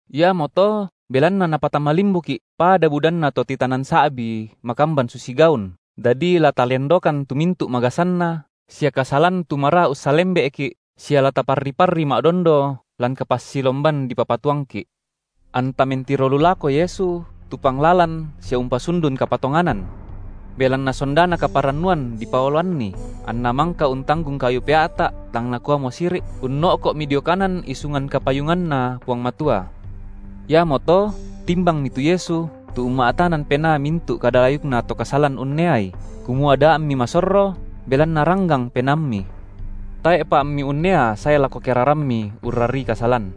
Iamoto belanna napatama limbuki’ pada budanna to titanan sa’bi makamban susi gaun, dadi la talendokan tu mintu’ magasanna, sia kasalan tu maraa ussalembe’ki’ sia la taparri-parri ma’dondo lan kapassilomban dipapatuangki’, anta mentiro lu lako Yesu, tu panglalan sia umpasundun kapatonganan. Belanna sondana kaparannuan dipaoloanNi, anNa mangka untanggung kayu pea’ta’ tang Nakuamo siri’, unno’ko’mi dio kanan isungan kapayunganNa Puang Matua. Iamoto, timbangmi tu Yesu, tu umma’tanan penaa mintu’ kada layukna to kasalan unneai, kumua da ammi masorro, belanna ranggang penaammi. Tae’pa ammi unnea sae lako kerarammi urrarii kasalan.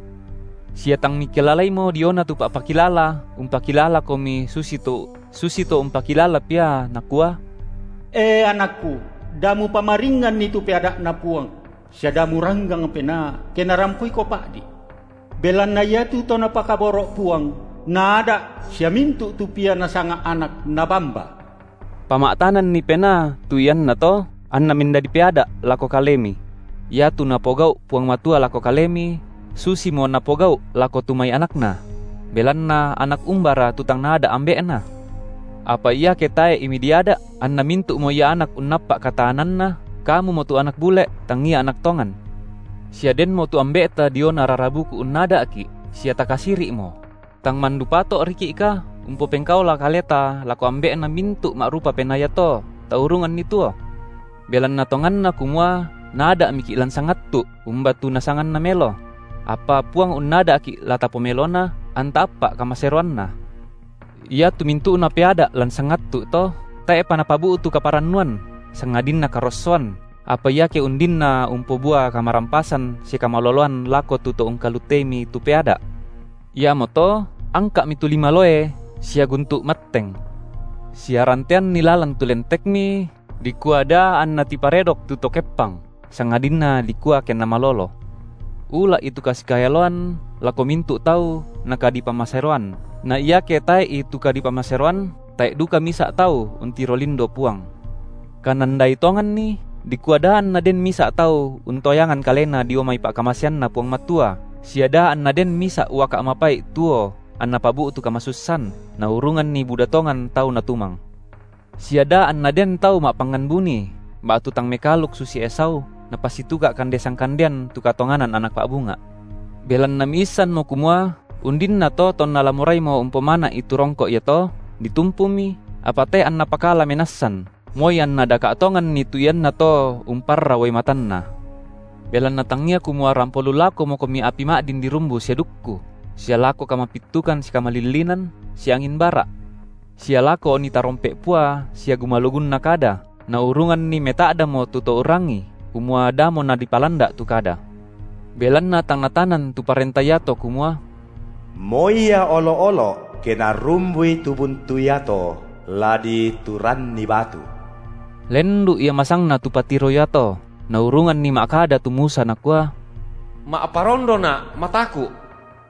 Sia tang mikilalaimo diona tu pa’pakilala umpakilalakomi susito umpakilala pia, nakua: E anakku, da mupamaringnganni tu peada’Na Puang, sia da muranggang penaa, ke narampoiko pa’di’; belanna iatu to Napakaboro’ Puang, Naada’ sia mintu’ tu pia Nasanga anak, Nabamba. Pama’tananni penaa tu iannato, anna mendadi peada’ lako kalemi; iatu Napogau’ Puang Matua lako kalemi, susimo Napogau’ lako tu mai anakNa; belanna anak umbara tu tang naada’ ambe’na? Apa iake tae’i midiada’, anna mintu’mo ia anak unnappa’ kataananna, kamumo tu anak bule’, tangia anak tongan. Sia denmo tu ambe’ta diona rara buku unnada’ki’, sia takasiri’mo; tang mandu pato’riki’ka umpopengkaola kaleta lako Ambe’na mintu’ ma’rupa penaa iato, taurunganni tuo? Belanna tonganna kumua naada’miki’ lan sangattu’, umba tu nasanganna melo; apa Puang unnada’ki la tapomelona, anta appa’ kamaseroanNa. Iatu mintu’na peada’ lan sangattu’ to, tae’pa napabu’tu kaparannuan, sangadinna karossoan, apa iake undinna umpobua kamarampasan sia kamaloloan lako tu to ungkaluteimi tu peada’. Iamoto angka’mi tu lima loe sia guntu’ matteng; sia ranteanni lalan tu lentekmi, dikua da anna tiparedok tu to keppang, sangadinna dikua kenna malolo. Ula’i tu kasikaeloan lako mintu’ tau na kadipamaseroan, na iake tae’i tu kadipamaseroan, tae’ duka misa’ tau untiro lindo Puang. Kanandai tonganni, dikua da anna den misa’ tau untoyangan kalena dio mai pa’kamaseanNa Puang Matua, sia da anna den misa’ uaka’ mapai’ tuo anna pabu’tu kamasussan, naurunganni buda tongan tau natumang; sia da anna den tau ma’pangngan buni ba’tu tang mekaaluk susi Esau, napasituka’ kande sangkandean tu katonganan anak pa’bunga’. Belanna miissanmo kumua undinnato tonna la moraimo umpomana’i tu rongko’ iato, ditumpumi, apa tae’ anna pakala menassan, moi anna daka’ tonganni tu iannato umparra uai matanna. Belanna tangia kumua rampo lu lakomokomi api ma’din dirumbu sia dukku, sia lako kamapittukan sia kamalillinan, sia angin bara’, sia lako oni tarompe’ pua sia gumalugunna kada, naurunganni meta’damo tu to urrangii, kumua damo nadipalanda’ tu kada. Belanna tang natanan tu parenta iato kumua: Moi ia olo’-olo’, ke narumbui tu buntu iato, la dituranni batu. Lendu’ ia masangna tu patiro iato, naurunganni ma’kada tu Musa nakua: Ma’parondona’ mataku’.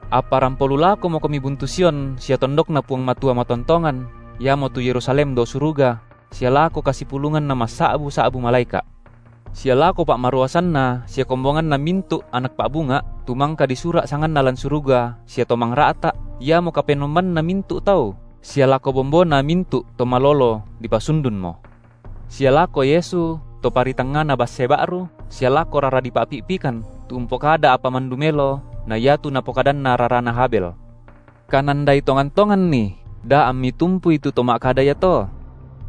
Apa rampo lu lakomokomi buntu Sion sia tondokNa Puang Matua matontongan, iamotu Yerusalem dao suruga, sia lako kasipulunganna massa’bu-sa’bu malaeka’, sia lako pa’maruasanna sia kombonganna mintu’ anak pa’bunga’, tu mangka disura’ sanganna lan suruga sia Tomangra’ta’, iamo Kapenombanna mintu’ tau, sia lako bombona mintu’ to malolo dipasundunmo, sia lako Yesu, To paritangngana basse ba’ru, sia lako rara dipa’pi’pikan, tu umpokada apa mandu melo na iatu napokadanna rarana Habel. Kanandai tongan-tonganni, da ammi tumpui tu To ma’kada iato.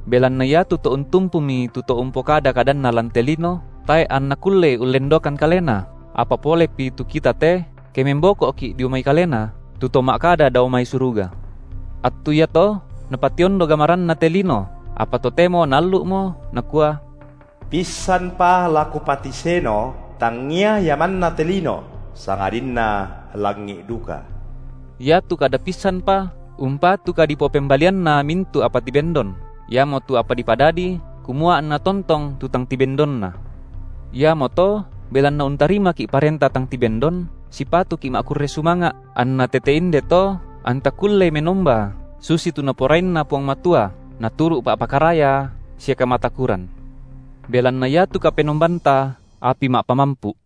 Belanna iatu to untumpumi tu To umpokada kadanna lan te lino, tae’ anna kullei ullendokan kalena, apa polepi tu kita te, ke memboko’ki’ dio mai Kalena, tu To ma’kada dao mai suruga. Attu iato Napationdo gamaranNa te lino, apa totemo Naallu’mo, Nakua: Pissanpa la Kupatiseno tangia ia manna te lino, sangadinna langi’ duka. Iatu kada pissanpa umpatu kadipopembalianna mintu’ apa tibendon, iamotu apa dipadadi, kumua anna tontong tu tang tibendonna. Iamoto, belanna untarimaki’ parenta tang tibendon, sipatuki’ ma’kurre sumanga’, anna tete inde to anta kullei menomba susitu Naporainna Puang Matua, naturu’ pa’pakaraya sia kamatakuran. Belanna iatu Kapenombanta api ma’pamampu’.